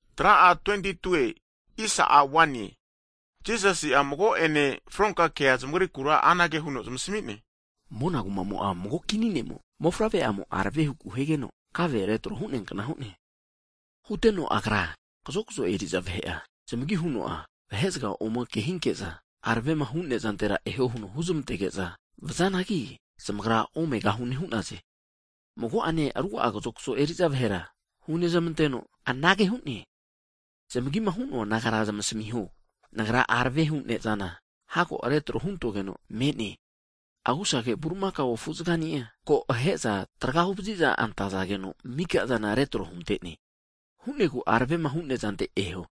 Hagi Jisasi'a fronka kea mago'ene zamagrikura anage huno zamasami'ne. Mona kumamo'a mago kini ne'mo mofavre'amo arave huku higeno kave retro hu'neankna hu'ne. Huteno agra kazokzo eri'za vahe'a, zamagima hu'noa vahe'zaga ome kehinke'za, aravemahu nezantera eho huno huzmantege'za vazanagi, zamagra omegahune hu'naze. Mago'ene ruga'a kazokzo eri'za vahera hunezmanteno, anage hu'ne, zamagima hu'noa nagara zamasamiho, Nagra aravehu ne'zana hago retro huntogeno me'ne. Ve bulimakaone agusage afu'zagani'a, ko ahe'za traga huvazi antazageno, mika'zana retro hunte'naze. Ana hu'negu aravemahu nezante eho.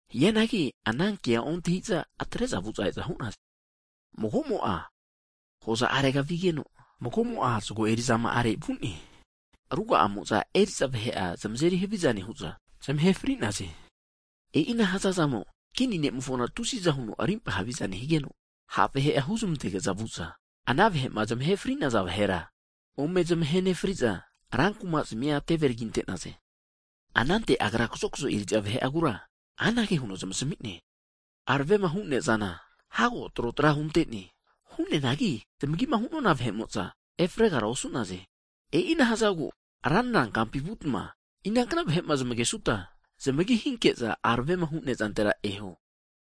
Hianagi anankea ontahiza atre'za vu'za e'za hu'naze. Mago'mo'a hoza arega vigeno, mago'mo'a zago eri'za ma'are vu'ne. Ruga'amo'za eri'za vahe'zamia zamazeri haviza nehu'za, zamahe fri'naze. E'ina hazazamo, kini ne'mofona tusiza huno rimpa haviza higeno, sondia vahe'a huzmantege'za vu'za ana vahe'ma zamahe fri'naza vahera ome zamahe nefri'za, rankumazmia teve taginte'naze. Anante Agra kazokzo eri'za vahe'agura anage huno zamasmi'ne, aravema hu ne'zana hago trotra hunte'ne. Hu'neanagi zamagima hu'nona vahe'mo'za efregara osu'naze. E'ina hazagu, ranra kampi vutma inankna vahe'ma zmagesuta, zmagi hinke'za aravema hu nezantera eho.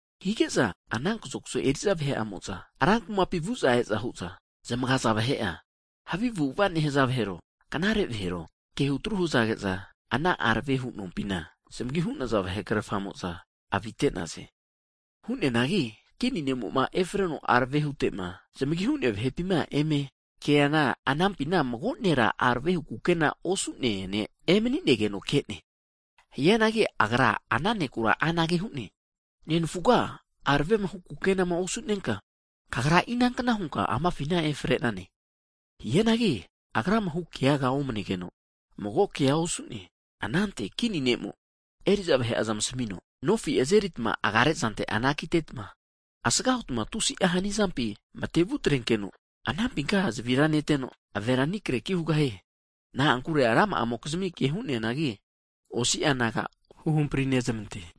Hige'za ana kazokzo eri'za vahe'amo'za rankuma kampi vu'za e'za hu'za zmagaza vahe'a, havi avu'ava nehaza vahero, knare vahero kehutru hazage'za, ana aravehu nompina, zamagi hu'naza vahe'krerfamo'za avite'naze. Hu'neanagi, Kini ne'mo'ma efreno arave hutema zmagi hu'nea vahepima eme keana, anampina mago nera aravehu kukena osu'nea ne' emani'negeno ke'ne. Hagi Agra ana neku anage hu'ne, nenfuga aravemahu kukenama osu'nenka kagra inankna hunka amafina efre'nane? Hianagi agrama hukeaga omne'geno mago keaga osu'ne. Anante Kini ne'mo eri'za vahe'a zamasamino, azeritma nofi agare azante anakitetma, asgahutma tusi'a hanizampi matevutrenkeno, anampinka zavira neteno, ave aninkreki hino hu'ne. Na'ankure ra'ma'amokizmi ke hu'neanagi, osi'a naga huhampri nezmante.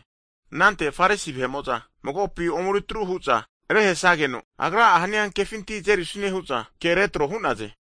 Anante Farisi vahe'mo'za magopi omeri truhu'za, rehesageno, Agra'a hania kefinti azerisune hu'za ke retro hu'naze.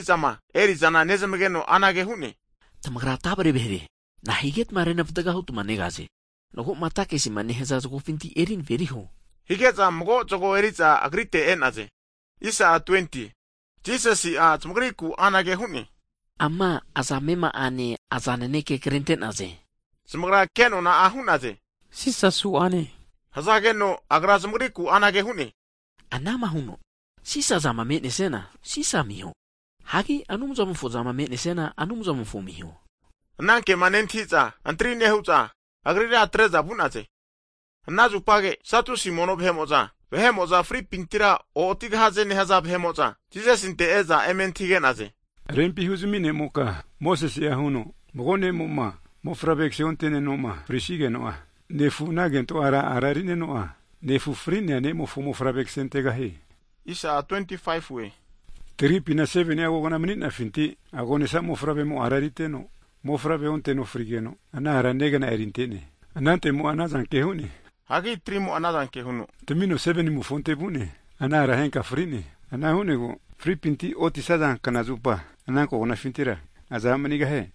Hianagi Jisasi'a havi antahi'zama eri'zana nezmageno anage hu'ne, Tamagra tavre vahere! Na'a higetma renvatga huta negaze? Mago'ma takisima nehaza zagofinti eri naveriho, hige'za mago zago eri'za Agrite e'naze. Jisasi'a zamagriku anage hu'ne, Ama aza amema'ane aza naneke krente'naze? Zamagra ke nona'a hu'naze, Sisa su'ane hazageno, Agra zamagriku anage hu'ne, anama huno, Sisa'zama me'nesiana, Sisa amiho. Hagi Anumzamofo zama me'nesiana, Anumzamofo amiho. Anankema nentahi'za antri nehu'za, Agrira atre'za vu'naze. Ana zupage Satusi mono vahe'mo'za, (vahe'mo'za fripintira o'otigahaze nehaza vahe'mo'za) Jisasinte e'za eme antahige'naze, Rempi huzami ne'moka, Mosesie'a huno, Mago'ne'mo'ma mofavre kase onte'nenoma frisigeno'a, nefu'a ana kentora a'erineno nefu fri'nea ne'mofo mofavre kasentegahie. Hagi tagripina 7ni'a kogna mani'nafinti, agonesa mofavremo a' eriteno, mofavre onteno fri'geno, ana ara negna erinte'ne. Anantemo'a anazanke hu'ne, hagi 3mo'a anazanke huno tamino 7nimofonte vu'ne. Ana ara henka fri'ne. Ana hu'negu Fripinti otisaza kna'zupa, ana kognafintira iza a' manigahie?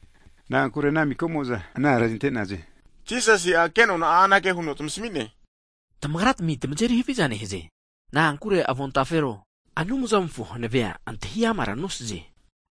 Na'ankure ana miko'mo'za ana ara erinte'naze. Jisasi'a kenona'a anage huno zamasmi'ne, Tamagratmi tamazeri havia nehaze, na'ankure avontafero, Anumzamofo hanavea antahi'amara nosaze.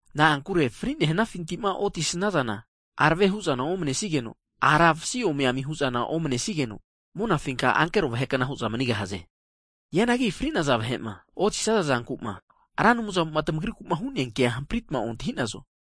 Na'ankure fri'nehnafinti'ma oti snazana, arave hu'zana omnesigeno, ara vasi omiami hu'zana omnesigeno, monafinka ankero vahe'kna hu'za manigahaze. Hianagi fri'naza vahe'ma otisaza zanku'ma Ra Anumzamo'ma tamagriku'ma hu'nea kea hamprita ontahinazo.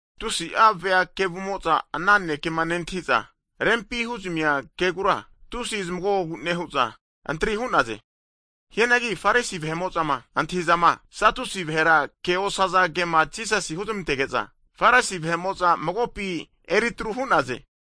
Tusi'a vea kevumo'za ana nanekema nentahi'za, rempima huzmia kegura tusi antri hu'naze. Hianagi Farisi vahe'mo'zama antahi'zama, Satusi vahera keosza kema Jisasi huzmantege'za, Farisi vahe'mo'za magopi eritru hu'naze.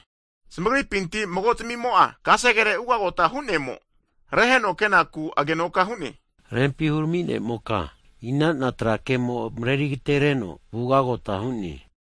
Zamagripinti mago'zmimo'a, kasegere ugagota hu'nemo, reheno kenaku anage huno agenoka hu'ne. Rempi huramine'moka, inana tra kemo mareri'agetereno vugagota hu'ne?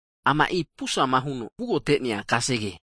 Ama e'i pusama huno, vugagote'nea kasege.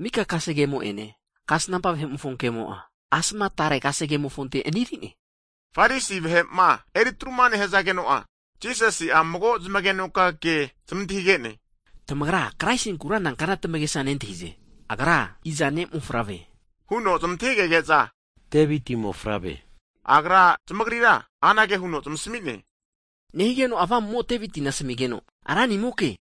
Mika kase'gemo'ene, kasnampa vahe'mofo kemo'a, asma tare tra kemofonte aniri'ne. Farisi vahe'ma eri'tru'ma nehazageno'a Jisasi'a mago zamagenoka ke zmantahige'ne, Tamagra Kraisinkura nankna tamagesa nentahi'ze? Agra iza ne' mofavre? Huno zmantahigege'za, Deviti mofavre hu'naze. Agra zamagrira anage huno zamasmi'ne, Nahigeno Avamumo'a Devitina asmigeno Ranimoke hu'ne?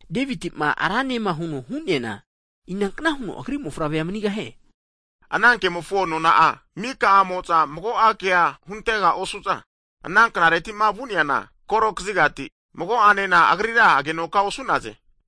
Deviti'ma, Rane huno'ma hu'neana, inankna huno agri mofavrea manigahie? Ana kemofo nona'a, mika'amo'za mago'a kea huntega osu'za, ana knareti'ma vu'neana koro hunente'za mago'anena, Agrira agenoka osu'naze.